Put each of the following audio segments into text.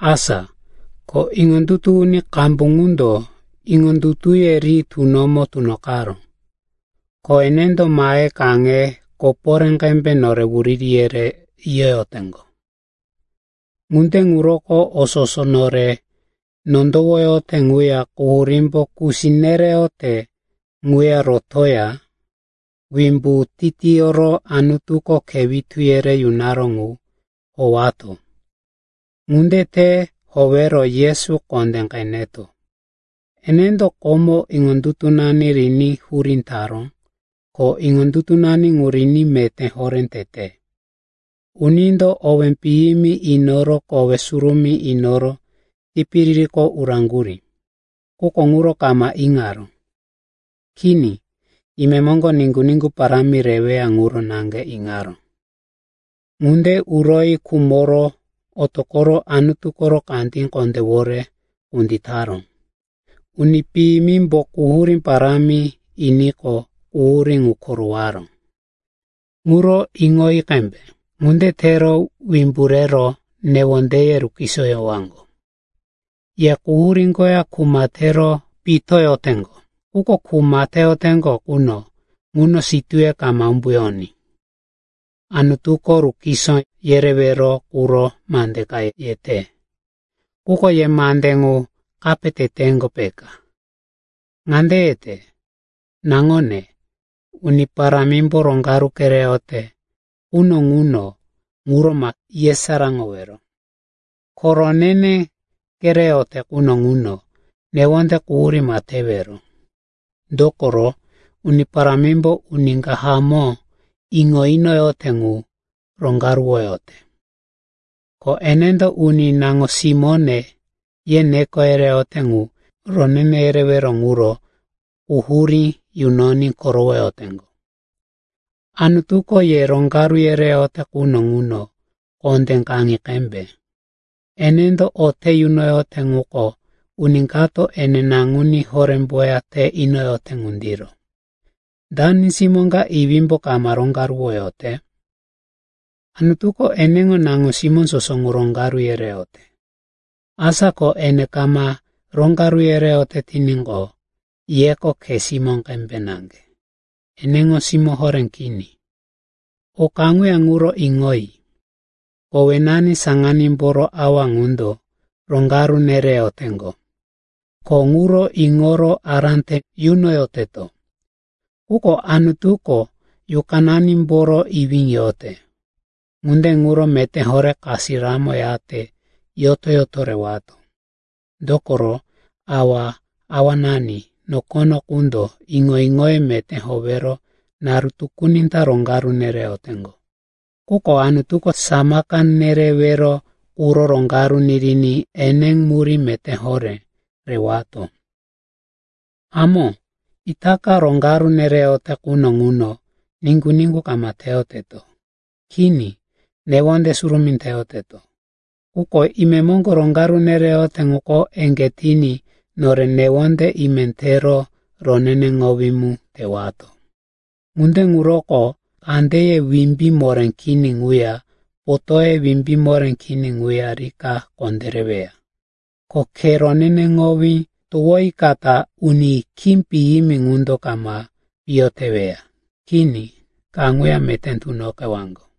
Asa ko iŋondutu uni qambu ŋundo iŋondutuye ri tunomo tunoqaró, ko enendo mahe kaŋe koporé qembe nore wuriri yere yiyoteŋgo. Ŋunde ŋuroko o soso nore nondowoyote ŋuya quhurímbo kusi nereyote ŋuya rotoya wimbu titiyoro Anutuko khe witu yere yunaró ŋu howato. Ŋunde te howero Yesu kondé qeneto. Enendo komo iŋondutunani riní hurí taró, ko iŋondutunani ŋu riní meté horé tete. Unindo owé piyimi inoro kowe surumí inoro tipiririko uraŋgurí. Quko ŋuro kama iŋaró. Kini, imemoŋgo niŋgu-niŋgu parámi reweya ŋuro naŋge iŋaró. Ŋunde uroyi khumoro otoqoro Anutu koro kandí kondéwore kunditaró. Uni piyimimbo quhurí parámi iniqo quhurí ŋu korowaró, ŋuro iŋoyi qembe. Ŋunde tero wimbu rero newondeye rukisoyowaŋgo. Ye quhurí koya kuma tero pitoyoteŋgo. Quko kuma teyoteŋgo quno ŋuno sitúye kama umbuyoní. Anutuko rukiso yerewero quro mande ka yete, quko ye mande ŋu kape teteŋgo, peka. Ŋande yete, “Naŋone, Uni Parámimbo roŋgaru kereyote quno ŋuno, ŋuro ma yesaráŋowero. Ko ronene kereyote quno ŋuno newonde quhurí ma tewero. Dokoro, Uni Parámimbo uni ka hamó iŋo inoyote ŋu roŋgaruwoyote, ko enendo uni ‘Naŋo-simóne,’ ye neko yereyote ŋu ronene yerewero ŋuro quhurí yunoní korowoyoteŋgo.” Anutuko ye roŋgaru yereyote quno ŋuno kondé kaŋi qembe. Enendo o te yunoyote ŋuko uni kato ene naŋuní horémboya te inoyote ŋundiro. Dani simó ka iwímbo kama roŋgaruwoyote? Anutuko eneŋo naŋo-simó soso ŋu roŋgaru yereyote. Asa ko ene kama roŋgaru yereyote tiníqo, yeko khe simó qembe naŋge, eneŋo simó horé kini. O kaŋuya ŋuro iŋoyi. Kowenani saŋanímboro awa ŋundo roŋgaru nereyoteŋgo, ko ŋuro iŋoro ará te yunoyoteto. Quko Anutuko yuqananimboro iwí yote. Ŋunde ŋuro meté horé kasiramo yate yoto-yoto rewato. Dokoro awa-awanani nokono qundo iŋo-iŋoye meté howero naru tukuni ta roŋgaru nereyoteŋgo. Quko Anutuko samaka nerewero quro roŋgaru niriní eneŋo murí meté horé rewato. Hamó, itaka roŋgaru nereyote quno ŋuno niŋgu-niŋgu kama teyoteto. Kini, newonde surumí teyoteto. Quko imemoŋgo roŋgaru nereyote ŋuko eŋgé tiní nore newonde ime tero roneneŋowí mu tewato. Ŋunde ŋuroko kandeye wimbí moré kini ŋuya potóye wimbí moré kini ŋuya rika kondéreweya. Ko khe roneneŋowí towoyikata uni khí piyimi ŋundo kama piyo teweya. Kini, kaŋuya meté tunoqewaŋgo.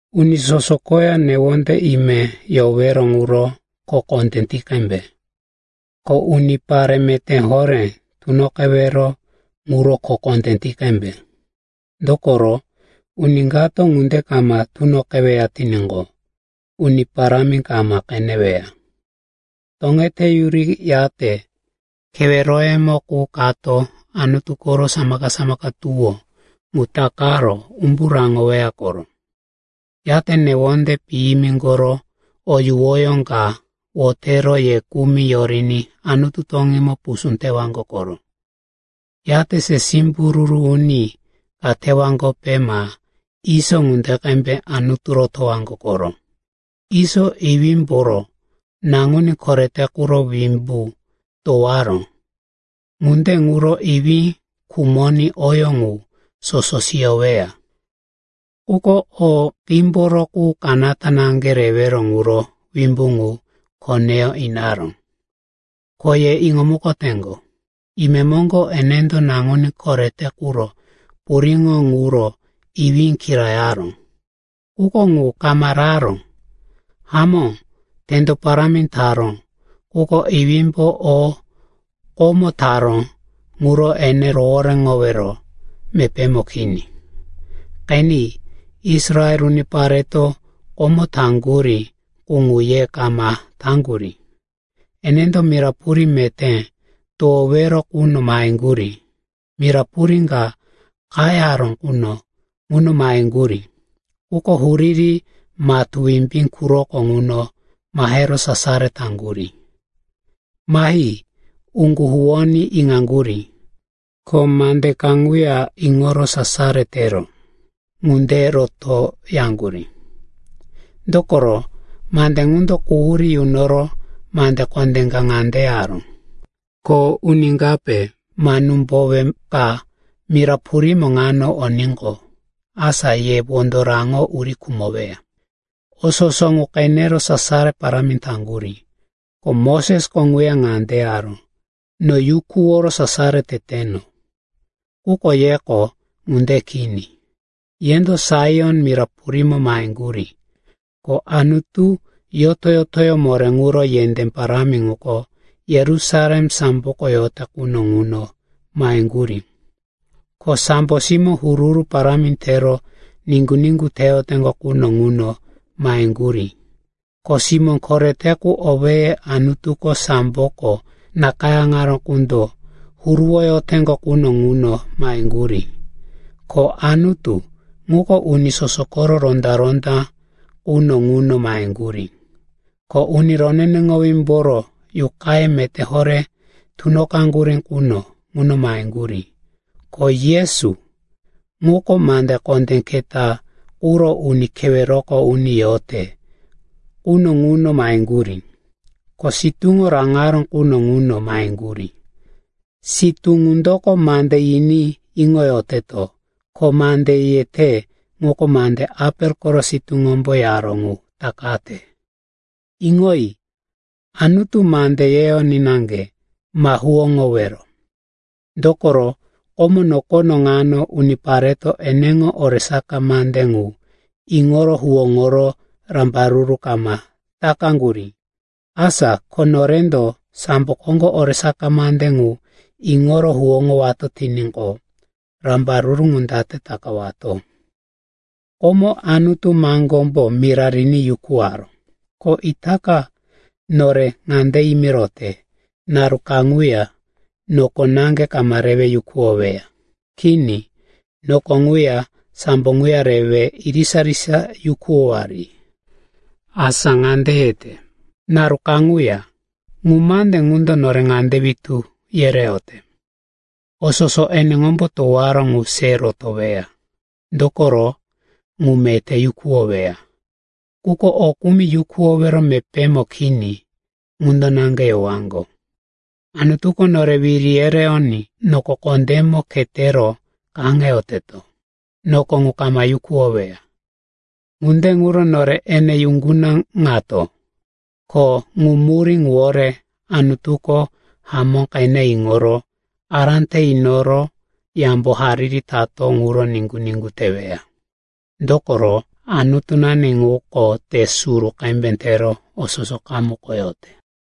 Uni soso koya newonde ime yowero ŋuro kho kondé ti qembe. Ko unipare meté horé tunoqewero ŋuro kho kondé ti qembe, dokoro uni kato ŋunde kama tunoqeweya tiníqo, Uni Parámi kama qeneweya. Toŋeteyuriyate keweroyemo qu kato Anutu koro samaka-samaka tuwó ŋu takaro umbu raŋoweya koro. Yate newonde piyimi koro o yuwoyó ka wotero ye kumi yoriní Anutu toŋímo pusú tewaŋgo koro. Yate se simbururu uni ka tewaŋgope ma Iso ŋunde qembe Anutu rotowaŋgo koro. Iso iwímboro naŋuní korete quro wimbu towaró, ŋunde ŋuro iwí khumoní oyó ŋu soso siyoweya. Quko o qímboro qu kanata naŋge rewero ŋuro wimbu ŋu koneyó inaró. Ko ye iŋomukoteŋgo, imemoŋgo enendo naŋuní korete quro puriŋo ŋuro iwí kirayaró, quko ŋu kama raró. Hamó, tendo parámi taró, quko iwímbo o komo taró ŋuro ene rohoréŋowero mepémo kini. Qeni, Israel unipareto komo taŋgurí qu ŋu ye kama taŋgurí. Enendo mira purí meté towowero quno maheŋgurí, mira purí ka qayaró quno ŋuno maheŋgurí quko huriri matú wimbí quroko ŋuno mahero sasaro taŋgurí. Mahi uŋgu huwoní iŋaŋgurí, ko mande ka ŋuya iŋoro sasaro tero, “Ŋunde roto,” yaŋgurí. Dokoro mande ŋundo quhurí yunoro mande kondé ka ŋande yaró, “Ko uni kape ma númbowe ka mira purímo ŋano oníqo, asa ye wondo raŋo uri khumoweya.” O soso ŋu qenero sasaro parámi taŋgurí, ko Mosesko ŋuya ŋande yaró, “No yukuworo sasaro teteno.” Quko yeko ŋunde kini. Yendo Saion mira purímo maheŋgurí, ko Anutu yoto-yotoyó moré ŋuro yendé parámi ŋuko Yerusalem samboko yote quno ŋuno maheŋgurí, ko sambo simó huru-huru parámi tero niŋgu-niŋgu teyoteŋgo quno ŋuno maheŋgurí, ko simó korete qu owéye Anutuko samboko nakayáŋaró qundo huruwoyoteŋgo quno ŋuno maheŋgurí, ko Anutu, ŋuko uni soso koro ronda-ronda quno ŋuno maheŋgurí, ko uni roneneŋowímboro yuqaye meté horé tunoqaŋgurí quno ŋuno maheŋgurí, ko Yesu, ŋuko mande kondé keta quro uni keweroko uni yote quno ŋuno maheŋgurí, ko sitúŋo raŋaró quno ŋuno maheŋgurí. Sitú ŋundoko mande yiní iŋoyoteto, ko mande yete ŋuko mande Apel koro sitúŋombo yaró ŋu takate. Iŋoyi, Anutu mande yeyoní naŋge ma huwóŋowero. Dokoro komo nokono ŋano unipareto eneŋo oresaka mande ŋu iŋoro huwóŋoro rambaruru kama takaŋgurí. Asa ko norendo sambo koŋgo oresaka mande ŋu iŋoro huwóŋowato tiníqo, rambaruru ŋu date takawato? Komoko Anutu maŋgómbo mira riní yukuwaró. Ko itaka nore ŋande yimirote, “Naru kaŋuya noko naŋge kama rewe yukuwoweya. Kini, noko ŋuya sambo ŋuya rewe irisa-irisa yukuwowari.” Asa ŋande yete, “Naru kaŋuya.” Ŋu mande ŋundo nore ŋande witú yereyote, o soso eneŋombo towaró ŋu se rotoweya, dokoro ŋu meté yukuwoweya. Quko o kumi yukuwowero mepémo kini, ŋundo naŋge yowaŋgo. Anutuko nore wiri yereyoní noko kondémo khetero kaŋeyoteto. Noko ŋu kama yukuwoweya. Ŋunde ŋuro nore ene yuŋgunaŋato, ko ŋu murí ŋuwore Anutuko hamó qene iŋoro ará te inoro yambo hariri tato ŋuro niŋgu-niŋgu teweya. Dokoro, “Anutunani ŋuko te suru qembe tero o soso qamukoyote.”